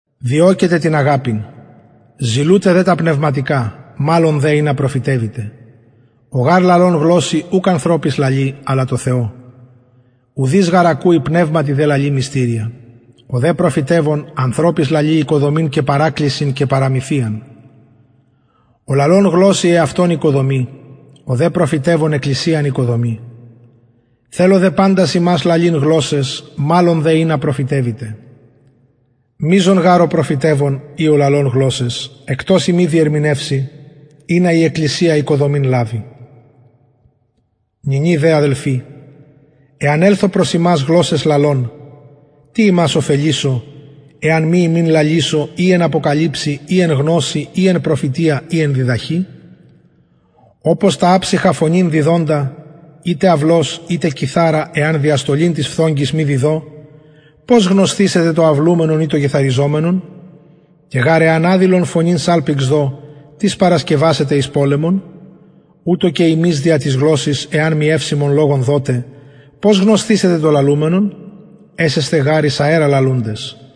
διωκετε την αγαπην ζηλουτε δε τα πνευματικα μαλλον δε ινα προφητευητε ο γαρ λαλων γλωσση ουκ ανθρωποις λαλει αλλα τω θεω ουδεις γαρ ακουει πνευματι δε λαλει μυστηρια ο δε προφητευων ανθρωποις λαλει οικοδομην και παρακλησιν και παραμυθιαν ο λαλων γλωσση εαυτον οικοδομει ο δε προφητευων εκκλησιαν οικοδομει θελω δε παντας υμας λαλειν γλωσσαις μαλλον δε ινα προφητευητε μειζων γαρ ο προφητευων η ο λαλων γλωσσαις εκτος ει μη διερμηνευει ινα η εκκλησια οικοδομην λαβη νυνι δε αδελφοι εαν ελθω προς υμας γλωσσαις λαλων τι υμας ωφελησω εαν μη υμιν λαλησω η εν αποκαλυψει η εν γνωσει η εν προφητεια η εν διδαχη ομως τα αψυχα φωνην διδοντα ειτε αυλος ειτε κιθαρα εαν διαστολην τοις φθογγοις μη διδω πως γνωσθησεται το αυλουμενον η το κιθαριζομενον και γαρ εαν αδηλον φωνην σαλπιγξ δω τις παρασκευασεται εις πολεμον ουτως και υμεις δια της γλωσσης εαν μη ευσημον λογον δωτε πως γνωσθησεται το λαλουμενον εσεσθε γαρ εις αερα λαλουντες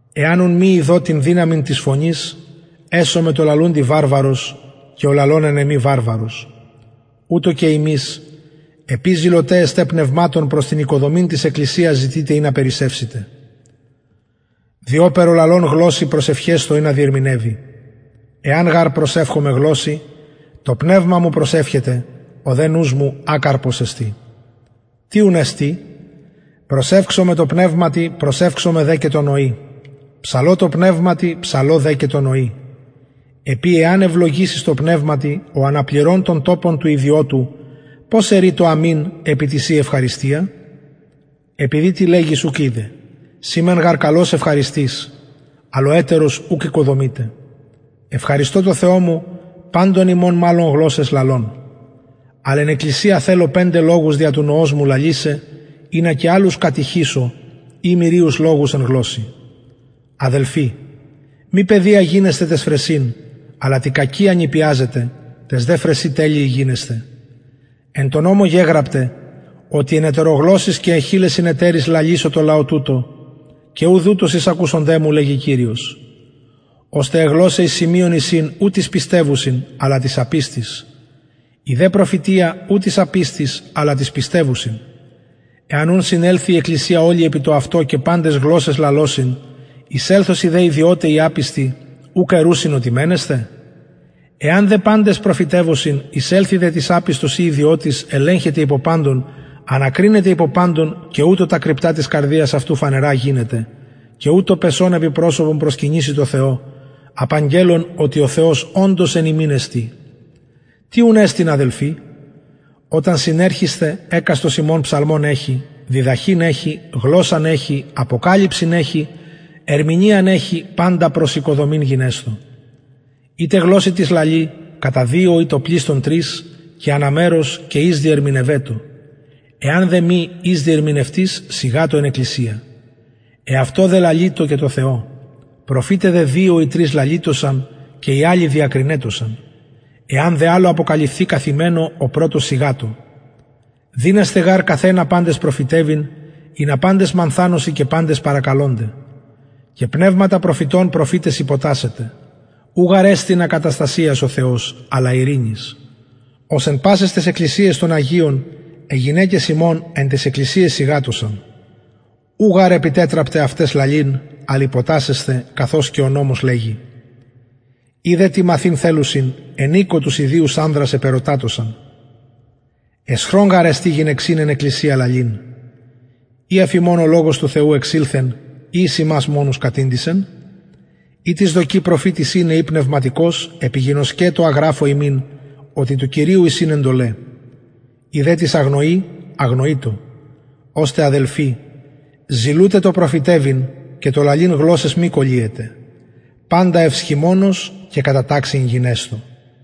εαν ουν μη ειδω την δυναμιν της φωνης εσομαι τω λαλουντι βαρβαρος και ο λαλων εν εμοι βαρβαρος ουτως και υμεις επει ζηλωται εστε πνευματων προς την οικοδομην της εκκλησιας ζητειτε ινα περισσευητε διοπερ ο λαλων γλωσση προσευχεσθω ινα διερμηνευη εαν γαρ προσευχωμαι γλωσση το πνευμα μου προσευχεται ο δε νους μου ακαρπος εστιν τι ουν εστιν προσευξομαι τω πνευματι προσευξομαι δε και τω νοι ψαλω τω πνευματι ψαλω δε και τω νοι επει εαν ευλογησης τω πνευματι ο αναπληρων τον τοπον του ιδιωτου πως ερει το αμην επι τη ση ευχαριστια επειδη τι λεγεις ουκ οιδεν συ μεν γαρ καλως ευχαριστεις αλλ ο ετερος ουκ οικοδομειται ευχαριστω τω θεω μου παντων υμων μαλλον γλωσσαις λαλων αλλ εν εκκλησια θελω πεντε λογους δια του νοος μου λαλησαι ινα και αλλους κατηχησω η μυριους λογους εν γλωσση αδελφοι μη παιδια γινεσθε ταις φρεσιν αλλα τη κακια νηπιαζετε ταις δε φρεσιν τελειοι γινεσθε εν τω νομω γεγραπται οτι εν ετερογλωσσοις και εν χειλεσιν ετεροις λαλησω τω λαω τουτω και ουδ ουτως εισακουσονται μου λεγει κυριος ωστε αι γλωσσαι εις σημειον εισιν ου τοις πιστευουσιν αλλα τοις απιστοις η δε προφητεια ου τοις απιστοις αλλα τοις πιστευουσιν εαν ουν συνελθη η εκκλησια ολη επι το αυτο και παντες γλωσσαις λαλωσιν εισελθωσιν δε ιδιωται η απιστοι ουκ ερουσιν οτι μαινεσθε εαν δε παντες προφητευωσιν εισελθη δε τις απιστος η ιδιωτης ελεγχεται υπο παντων ανακρινεται υπο παντων και ουτως τα κρυπτα της καρδιας αυτου φανερα γινεται και ουτως πεσων επι προσωπον προσκυνησει τω θεω απαγγελλων οτι ο θεος οντως εν υμιν εστιν τι ουν εστιν αδελφοι οταν συνερχησθε εκαστος υμων ψαλμον εχει διδαχην εχει γλωσσαν εχει αποκαλυψιν εχει ερμηνειαν εχει παντα προς οικοδομην γινεσθω ειτε γλωσση τις λαλει κατα δυο η το πλειστον τρεις και ανα μερος και εις διερμηνευετω εαν δε μη η διερμηνευτης σιγατω εν εκκλησια εαυτω δε λαλειτω και τω θεω προφηται δε δυο η τρεις λαλειτωσαν και οι αλλοι διακρινετωσαν εαν δε αλλω αποκαλυφθη καθημενω ο πρωτος σιγατω δυνασθε γαρ καθ ενα παντες προφητευειν ινα παντες μανθανωσιν και παντες παρακαλωνται και πνευματα προφητων προφηταις υποτασσεται ου γαρ εστιν ακαταστασιας ο θεος αλλα ειρηνης ως εν πασαις ταις εκκλησιαις των αγιων αι γυναικες υμων εν ταις εκκλησιαις σιγατωσαν ου γαρ επιτετραπται αυταις λαλειν αλλ υποτασσεσθαι καθως και ο νομος λεγει ει δε τι μαθειν θελουσιν εν οικω τους ιδιους ανδρας επερωτατωσαν αισχρον γαρ εστιν γυναιξιν εν εκκλησια λαλειν η αφ υμων ο λογος του θεου εξηλθεν η εις υμας μονους κατηντησεν ει τις δοκει προφητης ειναι η πνευματικος επιγινωσκετω α γραφω υμιν οτι κυριου εισιν εντολαι ει δε τις αγνοει αγνοειτω ωστε αδελφοι ζηλουτε το προφητευειν και το λαλειν γλωσσαις μη κωλυετε παντα ευσχημονως και κατα ταξιν γινεσθω